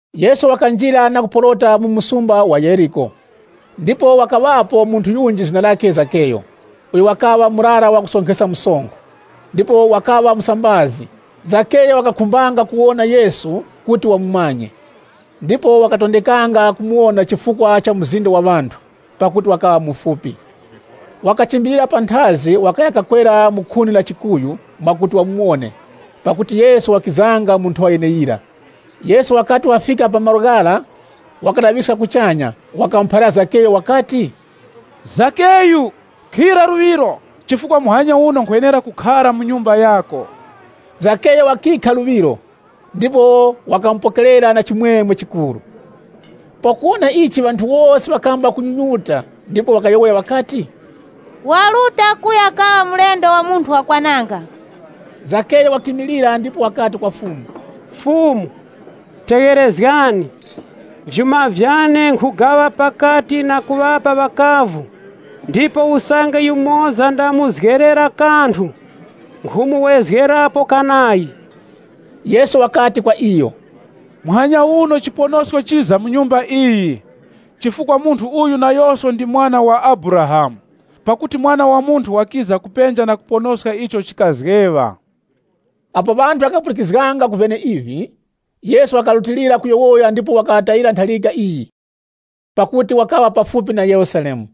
Yesu wakanjira na kuporota mu msumba wa Yeriko. Ndipo wakaŵapo munthu yunji zina lakhe Zakeyu, uyo wakaŵa murara wa kusonkheska msonkho, ndipo wakaŵa musambazi. Zakeyu wakakhumbanga kuwona Yesu kuti wamumanye, ndipo wakatondekanga kumuwona chifukwa cha mzinda wa ŵanthu, pakuti wakaŵa mufupi. Wakachimbilira panthazi, wakaya kakwera mu khuni la chikuyu mwakuti wamuwone, pakuti Yesu wakizanga mu nthowa yeneyira. Yesu wakati wafika pa malo ghara wakalaŵiska kuchanya, wakamuphalira Zakeyu wakati, “Zakeyu, khira luŵiro chifukwa muhanya uno nkhwenera kukhara mu nyumba yako.” Zakeyu wakikha luŵiro, ndipo wakamupokerera na chimwemwe chikuru. Pakuwona ichi ŵanthu wose ŵakamba kunyunyuta ndipo ŵakayowoya ŵakati, “Waruta kuya kaŵa mulendo wa munthu wakwananga.” Zakeyu wakimilira ndipo wakati kwa Fumu, “Fumu, tegherezgani, vyuma vyane nkhugaŵa pakati na kuŵapa ŵakavu, ndipo usange yumoza ndamuzgerera kanthu, nkhumuwezgerapo kanayi.” Yesu wakati kwa iyo, “Muhanya uno chiponosko chiza mu nyumba iyi, chifukwa munthu uyu nayoso ndi mwana wa Abrahamu. Pakuti Mwana wa Munthu wakiza kupenja na kuponoska icho chikazgeŵa.” Apo ŵanthu ŵakapulikizganga ku vyeneivi, Yesu wakarutilira kuyowoya ndipo wakaŵatayira ntharika iyi, pakuti wakaŵa pafupi na Yerusalemu.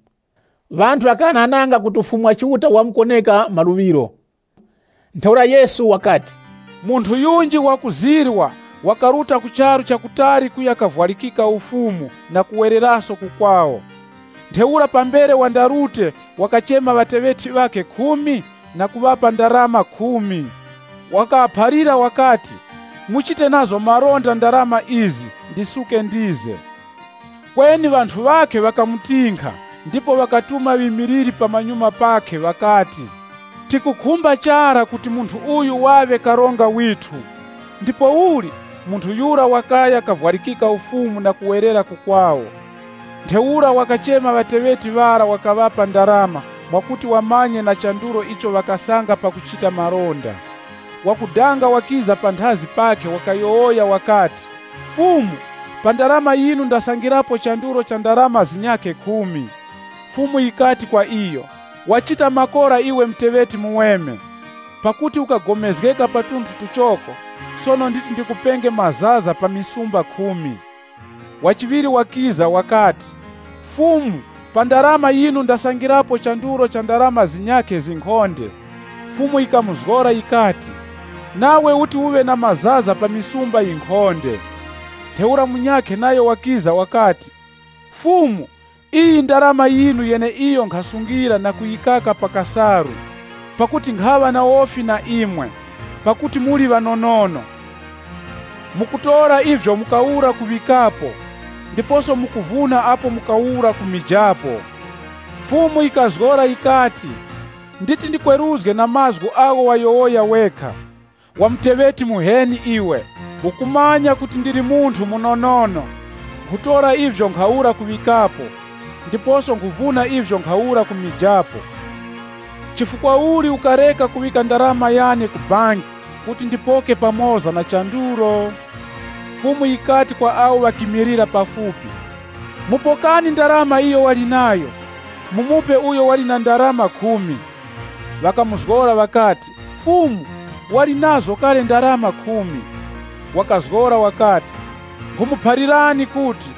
Ŵanthu ŵakaghanaghananga kuti Ufumu wa Chiuta wamkuwoneka maluŵiro. Ntheura Yesu wakati, “Munthu yunji wakuzirwa, wakaruta ku charu cha kutali kuya kavwarikika ufumu na kuwereraso ku kwawo. Ntheura pambere wandarute wakachema ŵateŵeti ŵakhe khumi na kuŵapa ndarama khumi. Wakaŵaphalira wakati, ‘Muchite nazo malonda ndarama izi ndisuke ndize.’ Kweni ŵanthu ŵakhe ŵakamutinkha ndipo ŵakatuma ŵimiliri pamanyuma pakhe ŵakati, ‘Tikukhumba chara kuti munthu uyu waŵe karonga withu!’ “Ndipouli, munthu yura wakaya kavwarikika ufumu na kuwerera ku kwawo. Ntheura wakachema ŵateŵeti ŵara wakaŵapa ndarama mwakuti wamanye na chandulo icho ŵakasanga pakuchita malonda. Wakudanga wakiza panthazi pakhe wakayowoya wakati, ‘Fumu, pa ndarama yinu ndasangirapo chandulo cha ndarama zinyakhe khumi.’ Fumu yikati kwa iyo, ‘Wachita makora iwe muteŵeti muweme, pakuti ukagomezgeka pa tunthu tuchoko, sono nditi ndikupenge mazaza pa misumba khumi.’ Wa chiŵiri wakiza wakati, ‘Fumu pa ndarama yinu ndasangirapo chandulo cha ndarama zinyakhe zinkhonde.’ Fumu yikamuzgora yikati, ‘Nawe uti uŵe na mazaza pa misumba yinkhonde.’ “Ntheura munyakhe nayo wakiza wakati, ‘Fumu, iyi ndarama yinu yeneiyo nkhasungilira na kuyikaka pa kasalu. Pakuti nkhaŵa na wofi na imwe, pakuti muli ŵanonono. Mukutora ivyo mukawura kuŵikapo, ndiposo mukuvuna apo mukawura kumijapo.’ Fumu yikazgora yikati, ‘Nditi ndikweruzge na mazgu agho wayowoya wekha, wa muteŵeti muheni iwe! Ukumanya kuti nkhaŵa munthu munonono, nkhutora ivyo nkhawura kuŵikapo, ndiposo nkhuvuna ivyo nkhawura kumijapo. Chifukwa uli ukareka kuŵika ndarama yane ku banki ya ndarama, kuti ndipoke pamoza na chandulo?’ “Fumu yikati kwa awo ŵakimilira pafupi, ‘Mupokani ndarama iyo wali nayo, mumupe uyo wali na ndarama khumi.’ Ŵakamuzgora ŵakati, ‘Fumu, wali nazo kale ndarama khumi.’ Wakazgora wakati, ‘Nkhumuphalirani kuti,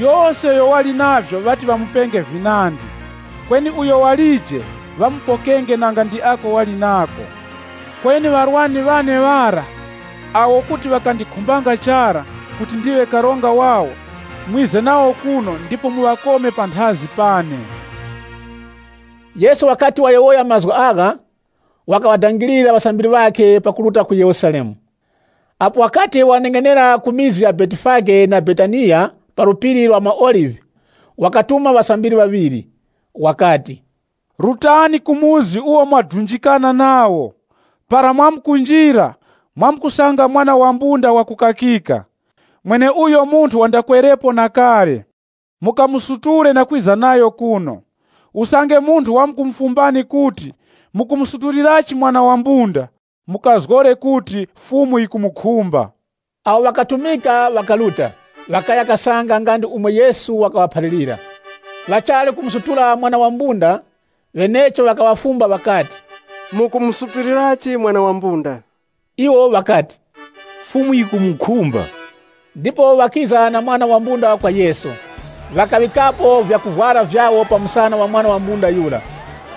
yose uyo wali navyo ŵati ŵamupenge vinandi. Kweni uyo walije, ŵamupokenge nanga ndi ako wali nako. Kweni ŵarwani ŵane ŵara, awo kuti ŵakandikhumbanga chara kuti ndiŵe karonga wawo, mwize nawo kuno ndipo muŵakome panthazi pane.’” Yesu wakati wayowoya mazgu agha, wakaŵadangirira ŵasambiri ŵakhe pakuruta ku Yerusalemu. Apo wakati waneng'enera ku mizi ya Betifage na Betaniya pa Phiri la maOlive, wakatuma ŵasambiri ŵaŵiri. Wakati, “Rutani ku chikaya icho mwadunjikana nacho. Para mwamkunjira, mwamkusanga mwana wa mbunda wakukakika, mweneuyo munthu wandakwerepo na kale. Mukamusutule na kwiza nayo kuno. Usange munthu wamkumufumbani kuti, ‘Mukumusutulirachi mwana wa mbunda?’ Mukazgore kuti, ‘Fumu yikumukhumba.’” Awo ŵakatumika ŵakaruta, ŵakaya kasanga nga ndi umo Yesu wakaŵaphalirira. Ŵachali kumusutula mwana wa mbunda, ŵenecho ŵakaŵafumba ŵakati, “Mukumusutulirachi mwana wa mbunda?” Iwo ŵakati, “Fumu yikumukhumba.” Ndipo ŵakiza na mwana wa mbunda kwa Yesu, ŵakaŵikapo vyakuvwara vyawo pa msana wa mwana wa mbunda yura,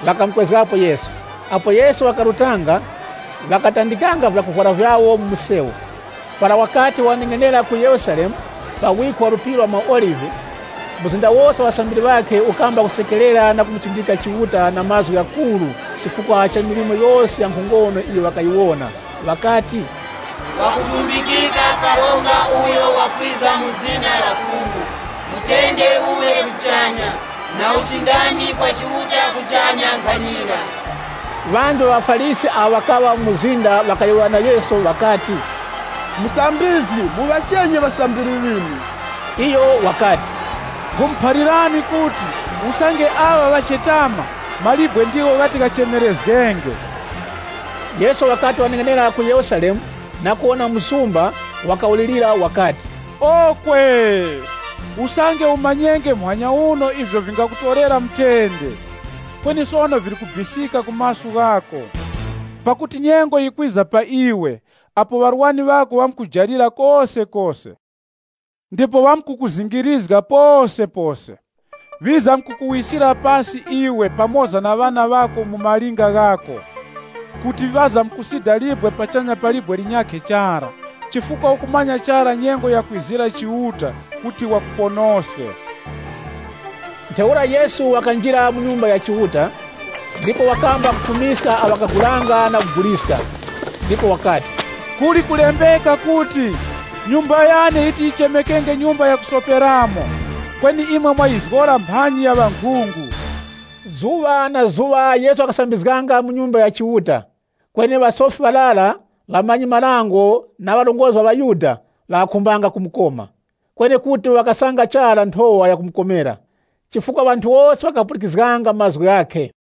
ŵakamukwezgapo Yesu. Apo Yesu wakarutanga, ŵakatandikanga vyakuvwara vyawo mu msewu. Para wakati waneng'enera ku Yerusalemu pa wikho wa Phiri la maOlive, mzinda wose wa ŵasambiri ŵakhe ukamba kusekerera na kumuchindika Chiuta na mazgu ghakuru, chifukwa cha milimo yose ya nkhongono iyo ŵakayiwona, ŵakati, “Ngwakutumbikika Karonga uyo wakwiza mu zina la Fumu! Mutende uŵe kuchanya, na uchindami kwa Chiuta kuchanya nkhanira.” Ŵanji ŵa ŵaFarisi awo ŵakaŵa mu mzinda ŵakayowoya na Yesu ŵakati, “Musambizgi, muŵachenye ŵasambiri ŵinu.” Iyo wakati, “Nkhumuphalirani kuti, usange aŵa ŵachetama, mawe ndigho ghati ghachemerezgenge.” Yesu wakati waneng'enera ku Yerusalemu na kuwona msumba, wakawulirira wakati, “Okwe! Usange umanyenge muhanya uno ivyo vingakutorera mutende! Kweni sono vili kubisika ku maso ghako. Pakuti nyengo yikwiza pa iwe apo ŵarwani ŵako ŵamkukujalira kosekose, ndipo ŵamkukuzingirizga posepose. Ŵizamkukuwiskira pasi iwe pamoza na ŵana ŵako mu malinga ghako. Kuti ŵamkusida libwe pachanya pa libwe linyakhe chara, chifukwa ukamanya chara nyengo yakwizira Chiuta kuti wakuponoske.” Ntheura Yesu wakanjira mu Nyumba ya Chiuta, ndipo wakamba kufumiska awo ŵakagulanga na kuguliska. Ndipo wakati, “Kuli kulembeka kuti, ‘Nyumba yane yiti yichemekenge nyumba ya kusoperamo,’ kweni imwe mwayizgora mphanji ya ŵankhungu.” Zuŵa na zuŵa Yesu wakasambizganga mu Nyumba ya Chiuta, kweni ŵasofi ŵarara, ŵamanyi-marango, na ŵarongozgi ŵa ŵaYuda ŵakakhumbanga kumukoma. Kweni kuti ŵakasanga chara nthowa yakumukomera, chifukwa ŵanthu wose ŵakapulikizganga mazgu ghakhe.